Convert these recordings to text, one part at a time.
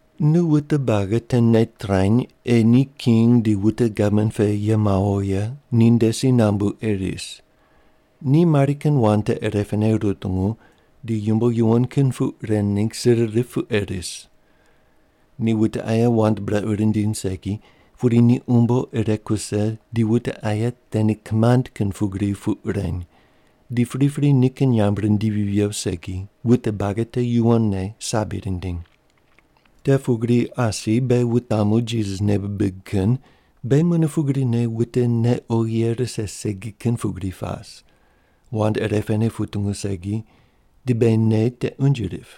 Nu wute buagi te nei trany ei ni king di wute gavman pe ye mawo ye ninde si nambu ei ris. Ni mari kin wand te irepene rutungu di yumbo yuwon kin puq ren ningg sir rip pu ei ris. Ni wute aye wand brequ rindiny segi, pudi ni umbo ire kuse di wute aye te ni kimand kin pugri puq reny di pripri nikin nyamb rindivi viyo segi wute buagi te yuwonne sabi rindiny. Te pugri asi beghi wutamu Jisas nei bibig kin beghi mune pugrine wute nei oghi ye rise segi kin pugri pas, wand irepene putungu segi di beghi nei te unje rip.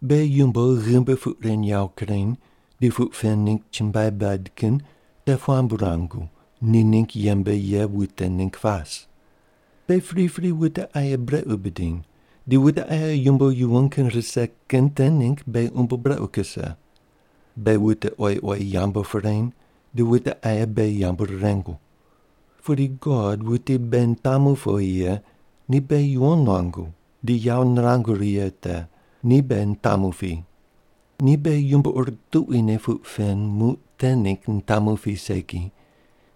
Beghi yumbo ghimbi puq ren yawo kureny di puq pen ningg chumbuai bad kin te puambu ruangu ni ningg yembe ye wute ningg pas. Beghi pripri wute aye brequ bidiny di wute aye yumbo yuwon kin rise kin te ningg beghi umbo brequ kuse. Beghi wute oyi oyi yambu pireny di wute aye beghi yambu rirengu. Pudi God wuti beghi nitamu powi ye ni beghi yuwon nuangu di yawo nirangu righe kin te, ni beghi nitamu pi. Ni beghi yumbo ur tuquine puq pen muq te ningg nitamu pi segi,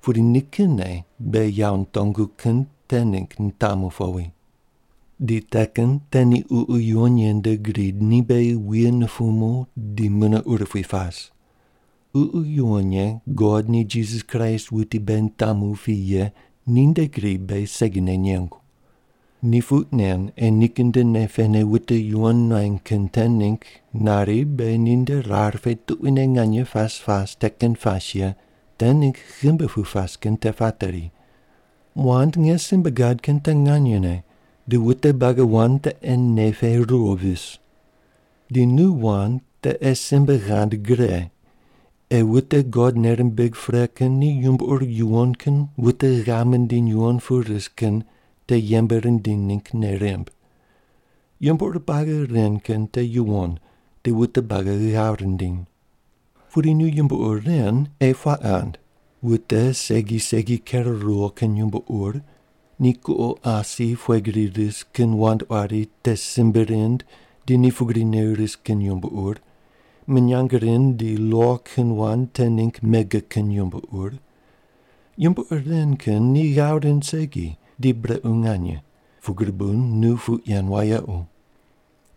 pudi nikinne beghi yawo nitongu kin te ningg nitamu powi. Di te kin te ni Ququ Yuwon Ye nde gri ni beghi wuye nupumu di mune urupui pas. Ququ Yuwon Ye God ni Jisas Kraist wuti beghi nitamu pi ye ninde gri beghi segine nengu. Ni puq nen ei nikin nde nei pene wute yuwon nuany kin te ningg nari beghi ninde rar pe tuquine nganye pas pas te kin pas ye te ningg ghimbi pu pas kin te pateri. Wand nge simbe gad kin te nganyene di wute buagi wand te ei nei pe ruwo vis. Di nu wand te ei simbe ghand gre ei wute God nei rimbig pre kin ni yumbo ur yuwon kin wute ghav mindiny yuwon pu ris kin te yembe rindiny ningg nei rimb. Yumbo ur buagi ren kin te yuwon di wute buagi ghav rindiny. Pudi nu yumbo ur ren ei puaq ghand: Wute segi segi ker ruwo kin yumbo ur, ni kuqo asi pughe gri ris kin wand quari te simbe rind di ni pugrine ris kin yumbo ur, minyang rind di lo kin wand te ningg mege kin yumbo ur. Yumbo ur ren kin ni ghav rind segi di brequ nganye, pugri bu nu puq yen wayequ.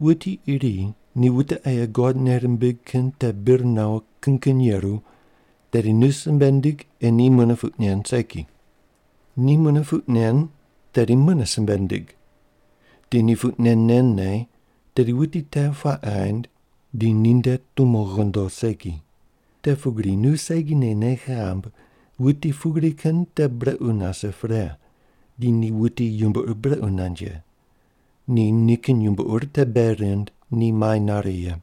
Wuti iri ni wute aye God nei rimbig kin te bir nawo kin kin yeru, tedi nu simbe ndig ei ni mune puq nen segi. Ni mune puq nen tedi mune simbe ndig. Di ni puq nen nen ne, tedi wuti te puaq ghaind di ninde tumo ghondo segi. Te pugri nu segine nei ghamb wuti pugri kin te brequ nase pre di ni wuti yumbo ur brequ nand ye. Ni nikin yumbo ur te bei rind ni mai nare ye.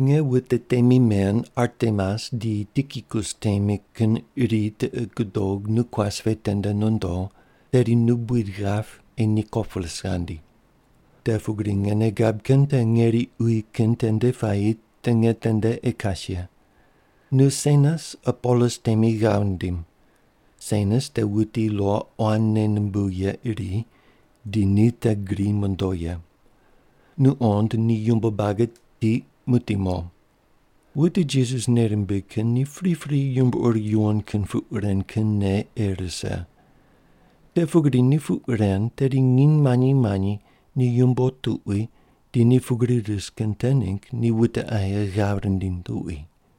Nge wute temi men Artemas di Tikikus temi kin iri tiqi gudog nu kuas pe tende nondo, tedi nu buid ghap ei Nikopolis ghandi. Te pugri nge nei gab kin te ngeri uyi kin tende puayi te nge tende ei kas ye. Nu Senas Apolos temi ghav ndim. Senas te wuti lo quan nei numbuw ye iri di ni te gri mondo ye. Nu qond ni yumbo buagi tiq muqdi mo. Wute Jisas nei rimbig kin ni pripri yumbo ur yuwon kin puq ren kin nei ei rise. Te pugri ni puq ren tedi nginy manyi manyi ni yumbo tuqui di ni pugri ris kin te ningg ni wute aye ghav rindiny tuqui.